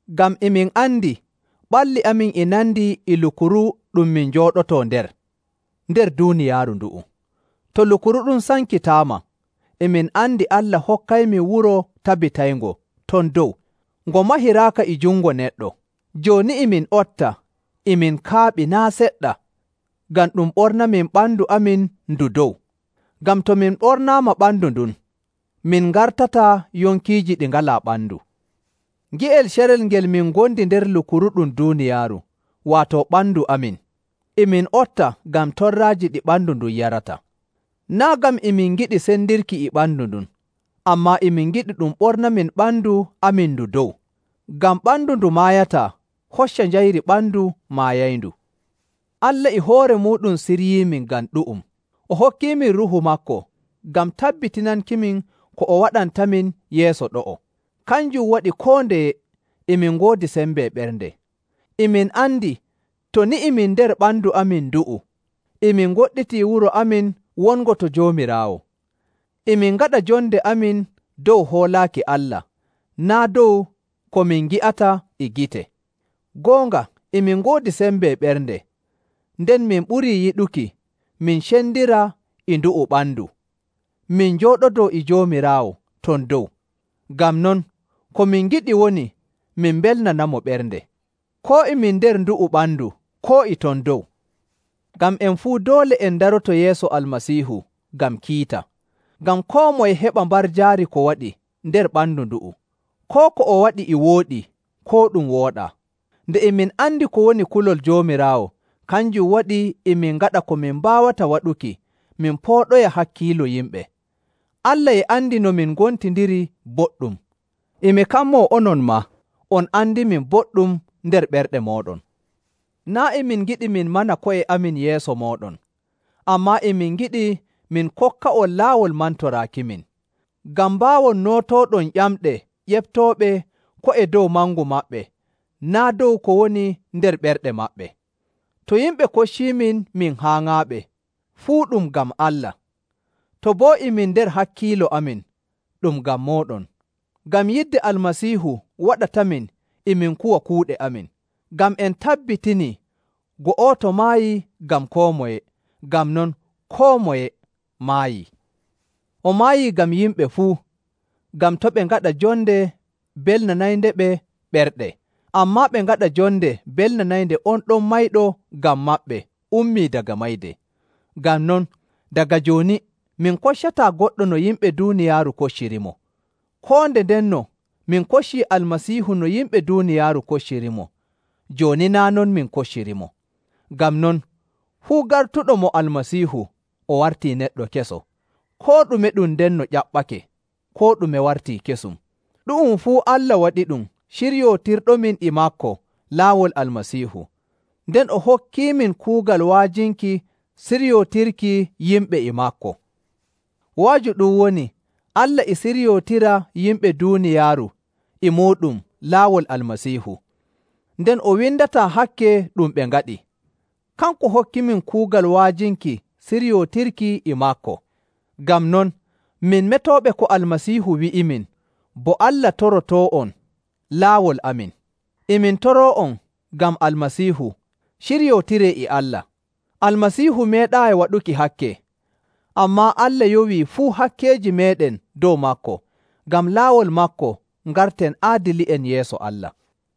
Ngam e min andi ɓalli amin e nandi e lukuru ɗum min njooɗotoo nder, nder duuniyaaru ndu'u. To lukuru ɗum sankitaama, e min andi Allah hokkaymin wuro tabitayngo ton dow, ngo mahiraaka e jungo neɗɗo. Jooni e min otta e min kaaɓii naa' seɗɗa ngam ɗum ɓornamin ɓandu amin ndu dow. Ngam to min ɓornaama ɓandu ndun, min ngartataa yonkiiji ɗi ngalaa ɓandu. Nge'el carel ngel min ngondi nder lukuru ɗum duuniyaaru, waato ɓandu amin, e min otta ngam torraaji ɗi ɓandu ndun yarata. Naa' ngam e min ngiɗi sendirki e ɓandu ndun, ammaa e min ngiɗi ɗum ɓornamin ɓandu amin ndu dow, ngam ɓandu ndu maayataa hocca njayri ɓandu maayayndu. Allah e hoore muuɗum siryiimin ngam ɗu'um, o hokkiimin Ruuhu maako ngam tabbitinankimin ko o waɗantamin yeeso ɗo'o. Kanjum waɗi koo ndeye e min ngoodi sembe ɓernde. E min andi to ni e min nder ɓandu amin ndu'u, e min ngoɗɗitii wuro amin wongo to Joomiraawo. E min ngaɗa jonde amin dow hoolaaki Allah, naa' dow ko min ngi'ata e gite. Goonga e min ngoodi sembe ɓernde, nden min ɓurii yiɗuki min cendira e ndu'u ɓandu min njooɗodoo e Joomiraawo ton dow. Ngam non, ko min ngiɗi woni min mbelnanamo ɓernde, koo e min nder ndu'u ɓandu koo e ton dow. Ngam en fuu doole en ndaroto yeeso Almasiihu ngam kiita, ngam koo moye heɓa mbarjaari ko waɗi nder ɓandu ndu'u, koo ko o waɗi e wooɗi koo ɗum wooɗaa. Nde e min andi ko woni kulol Joomiraawo, kanjum waɗi e min ngaɗa ko min mbaawata waɗuki min pooɗoya hakkiilo yimɓe. Allah e andi no min ngontindiri boɗɗum, e mi kammoo onon maa on andimin boɗɗum nder ɓerɗe mooɗon. Naa' e min ngiɗi min mana ko'e amin yeeso mooɗon, ammaa e min ngiɗi min kokka'on laawol mantoraakimin, ngam mbaawon nootooɗon ƴamɗe ƴeftooɓe ko'e dow mangu maɓɓe naa' dow ko woni nder ɓerɗe maɓɓe. To yimɓe kocciimin min haaŋaaɓe, fuu ɗum ngam Allah. To boo e min nder hakkiilo amin, ɗum ngam mooɗon. Ngam yidde Almasiihu waɗatamin e min kuwa kuuɗe amin, ngam en tabbitinii go'oto maayii ngam koo moye, ngam non koo moye maayii. O maayii ngam yimɓe fuu, ngam to' ɓe ngaɗa jonde belnanayndeɓe ɓerɗe, ammaa ɓe ngaɗa jonde belnanaynde on ɗon mayɗo ngam maɓɓe ummii daga mayde. Ngam non, daga jooni min koccataa goɗɗo no yimɓe duuniyaaru koccirimo. Koo nde ndenno min koccii Almasiihu no yimɓe duuniyaaru koccirimo, jooni naa' non min koccirimo. Ngam non, fuu gartuɗo mo Almasiihu o wartii neɗɗo keso. Koo ɗume ɗum ndenno ƴaɓɓake, koo ɗume wartii kesum. Ɗu'um fuu Allah waɗiɗum ciryootirɗomin e maako laawol Almasiihu, nden o hokkiimin kuugal wa'ajinki siryootirki yimɓe e maako. Wa'aju ɗum woni Allah e siryootira yimɓe duuniyaaru e muuɗum laawol Almasiihu, nden o windataa hakke ɗum ɓe ngaɗi. Kanko hokkimin kuugal wa'ajinki siryootirki e maako. Ngam non, min metooɓe ko Almasiihu wi'imin, bo Allah torotoo'on laawol amin. E min toroo'on ngam Almasiihu, ciryootiree e Allah. Almasiihu meeɗaayi waɗuki hakke, ammaa Allah yowii fuu hakkeeji meeɗen dow maako, ngam laawol maako ngarten aadili'en yeeso Allah.